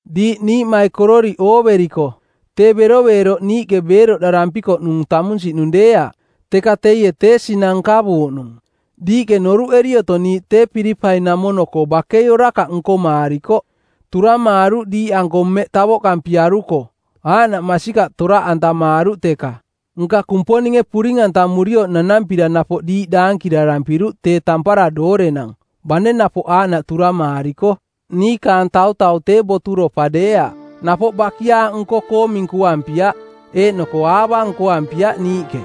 Diiꞌ niiꞌmaikororiꞌ ooveriko, tee beroveeroꞌ niiꞌke beeroꞌdarampikoꞌnung tamunsiꞌnung deeaꞌ, teka teie tee sinang nkavuuꞌnung. Diiꞌke noruꞌeri otong niiꞌ tee Pilipai-namono-koo bakei orakaꞌ nkomaarikoꞌ; turamaaruꞌ diiꞌanko mmeꞌ tavoꞌkampiaruko; aaꞌnaꞌ masikaꞌ toraꞌantamaaruꞌ teka. Nka Kumponinge puring-antamurioꞌ nanampira napoꞌ diiꞌ daankirarampiruꞌ tee tampara doorenang, bane napoꞌ aaꞌnaꞌ turamaariko. Niikaang tautau tee boturopa deeaꞌ; napoꞌ bakiaaꞌ nko-koo minkuampiaꞌ; eeꞌnoko aava nkoampiaꞌ niiꞌke.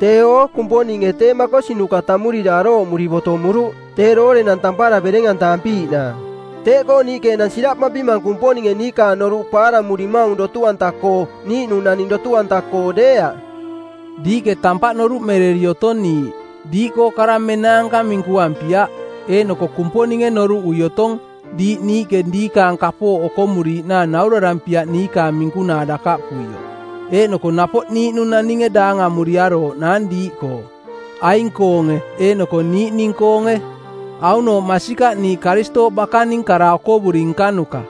Teeo, Kumponinge tee makosinuka tammurira arooꞌmuri botomuruꞌ tee doorenang tampara bereng-antavampiiꞌnaang. Teeꞌkoo niiꞌke enang siraꞌpampimang Kumponinge niikaang noruꞌ paaramurimaung dotu-anta-koo, niiꞌnung naning dotu-anta-koo deeaꞌ. Diiꞌke tampaꞌ noruꞌmereri otong niiꞌ. Diiꞌkoo kara menaanka minkuampiaꞌ. Eeꞌnoko Kumponinge noruꞌui otong diiꞌ niiꞌke diikaang kapooꞌ okomuriiꞌnaang navurarampiaꞌ niikaang minkunaa dakaꞌpuioꞌ. Eeꞌnoko napoꞌ niiꞌnung naninge daangamuriarooꞌnaang diiꞌkoo, aing-koonge eeꞌnoko niiꞌning-koonge. Aunooꞌ masikaꞌ niiꞌ Karistooꞌ bakaning kara okovuri nkanuka.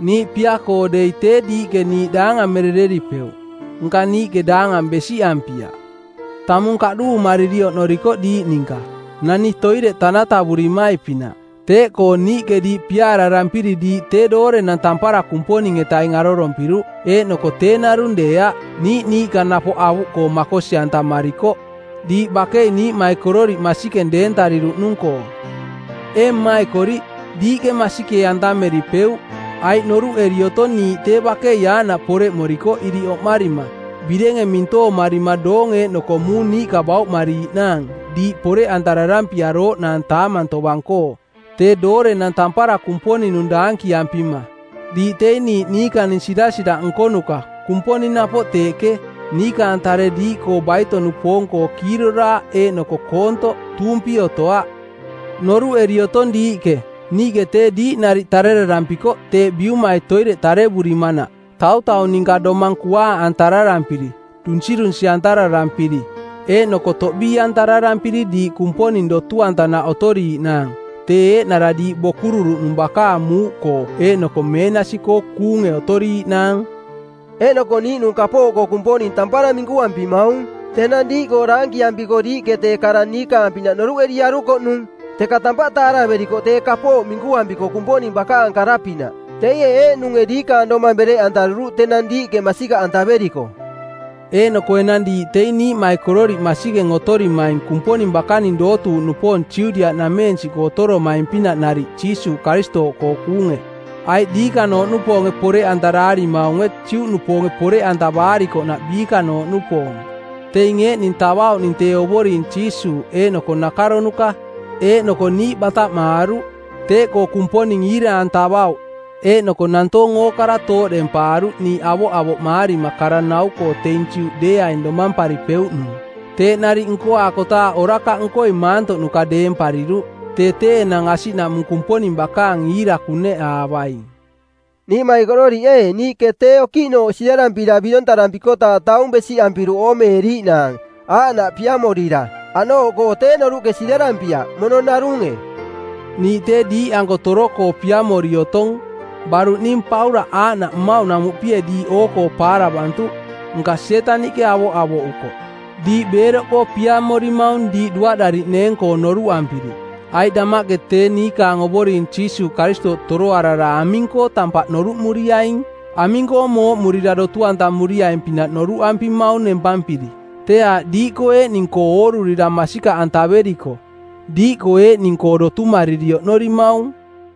Niiꞌ pia-koo dei tee diiꞌke niiꞌ daangamerereripeuꞌ. Nka niiꞌke daangang besiꞌampiaꞌ. Tamung kaꞌduumariri oꞌnorikoꞌ diiꞌ ninka, nani toireꞌ tanatavurimai-pinaꞌ. Teeꞌkoo niiꞌke diiꞌ piaararampiri diiꞌ tee doorenang tampara Kumponing-etaing arorompiruꞌ, eeꞌnoko tee narung deeaꞌ, niiꞌ niiꞌka napoꞌ avuꞌkoo makosi-antamarikoꞌ, diiꞌ bakei niiꞌmaikororiꞌ masikeng deentariruꞌnung-koo. Ee mmaikoriꞌ, diiꞌke masikee-antameripeuꞌ, aiꞌ noruꞌeri otong niiꞌ tee bakei aaꞌnaꞌ poreꞌmorikoꞌ iriꞌ oꞌmarima, birenge mintoomarima doong eeꞌnoko muung niiꞌka bauꞌmariiꞌnaang diiꞌ poreꞌantararampiarooꞌnaang taamang tovang-koo, tee doorenang tampara Kumponing-nung daankiampima. Diiꞌ teing niiꞌ niikaning sirasiraꞌ nkonuka, Kumponing napoꞌ teeꞌke, niikaang tare diiꞌkoo baito-nupoong-koo kiiroraaꞌ eeꞌnoko koontoꞌ, tuumpi otoaꞌ. Noruꞌeri otong diiꞌke, niiꞌke tee diiꞌ nariꞌ tarerarampikoꞌ teeꞌ biumai toireꞌ tarevurimanaꞌ, tautau ninka domang kuaaꞌantararampiri, dunsirunsi˜antararampiri, eeꞌnoko toꞌbii-antararampiri diiꞌ Kumponing dotu-antanaꞌ otoriiꞌnaang, tee eeꞌnara diiꞌ bokururuꞌnung bakaang muuꞌkoo eeꞌnoko meenasi-koo kuunge otoriiꞌnaang. Eeꞌnoko niiꞌnung kapooꞌkoo Kumponing tampara minkuampimaung: Tenang diiꞌkoo daankiampiko diiꞌke tee kara niikaang-pinaꞌ noruꞌeriarukoꞌnung, teka tampaꞌ taaraverikoꞌ tee kapooꞌ minkuampiko Kumponing bakaang kara-pinaꞌ, teie eeꞌnunge diikaang domang bereꞌantaruruꞌ tenang diiꞌke masikaꞌantaveriko. Eeꞌnoko enang diiꞌ teing niiꞌmaikororiꞌ masikeng otorimaing Kumponing bakaning dootuuꞌnupoong Judiaꞌnameensiꞌkoo otoromaing-pinaꞌ nariꞌ Jiisuuꞌ Karistooꞌkoo kuunge, aiꞌ diikanooꞌnupoonge poreꞌantaraarimaunge Juꞌnupoonge poreꞌantavaarikoꞌnaꞌ biikanooꞌnupoong. Teing eeꞌning tavauꞌning tee Ovoring Jiisuuꞌ eeꞌnoko nakaronuka˜, eeꞌnoko niiꞌ bataꞌmaaruꞌ. Teeꞌkoo Kumponing iira-antavauꞌ eeꞌnoko nantoong ookara tooꞌdempaaruꞌ niiꞌ avoꞌavoꞌmaarima kara nau-koo teing Juꞌ deeaing domamparipeuꞌnung. Teeꞌ nariꞌ nkoaakotaaꞌ orakaꞌnkoi maantoꞌnuka deempariruꞌ. Tee tee enang asiꞌnamuꞌ Kumponing bakaang iira kuneꞌaavaing. Niiꞌmaikororiꞌ ee, niiꞌke tee okiꞌnooꞌ siꞌdarampira birontarampi-kotaaꞌ taung besiꞌampiruꞌ oomeeriiꞌnaang, aaꞌnaꞌ piamorira. Aꞌnooꞌkoo tee noruꞌke siꞌdarampiaꞌ, mono narunge. Niiꞌ tee diiꞌanko toro-koo piamori otong. Baruꞌ ning Paulaꞌ aaꞌnaꞌ mmauꞌnamuꞌpie diiꞌ oo-koo paaravantuꞌ, nka Sietaniꞌke avoꞌavoꞌukoꞌ. Diiꞌ beeroꞌkoo piamorimang diiꞌ duaꞌdariꞌneeng-koo noruꞌampiri, aiꞌ damaꞌke tee niikaang Ovoring Jiisuuꞌ Karistooꞌ toroarara aming-koo tampaꞌ noruꞌmuriaing? Aming-koo mooꞌmurira dotu-antamuriaing-pinaꞌ noruꞌampimaung nempampiri? Tee aaꞌ diiꞌkoo eeꞌning-koo oorurira masikaꞌantaveriko. Diiꞌkoo eeꞌning-koo dotumariri oꞌnorimaung.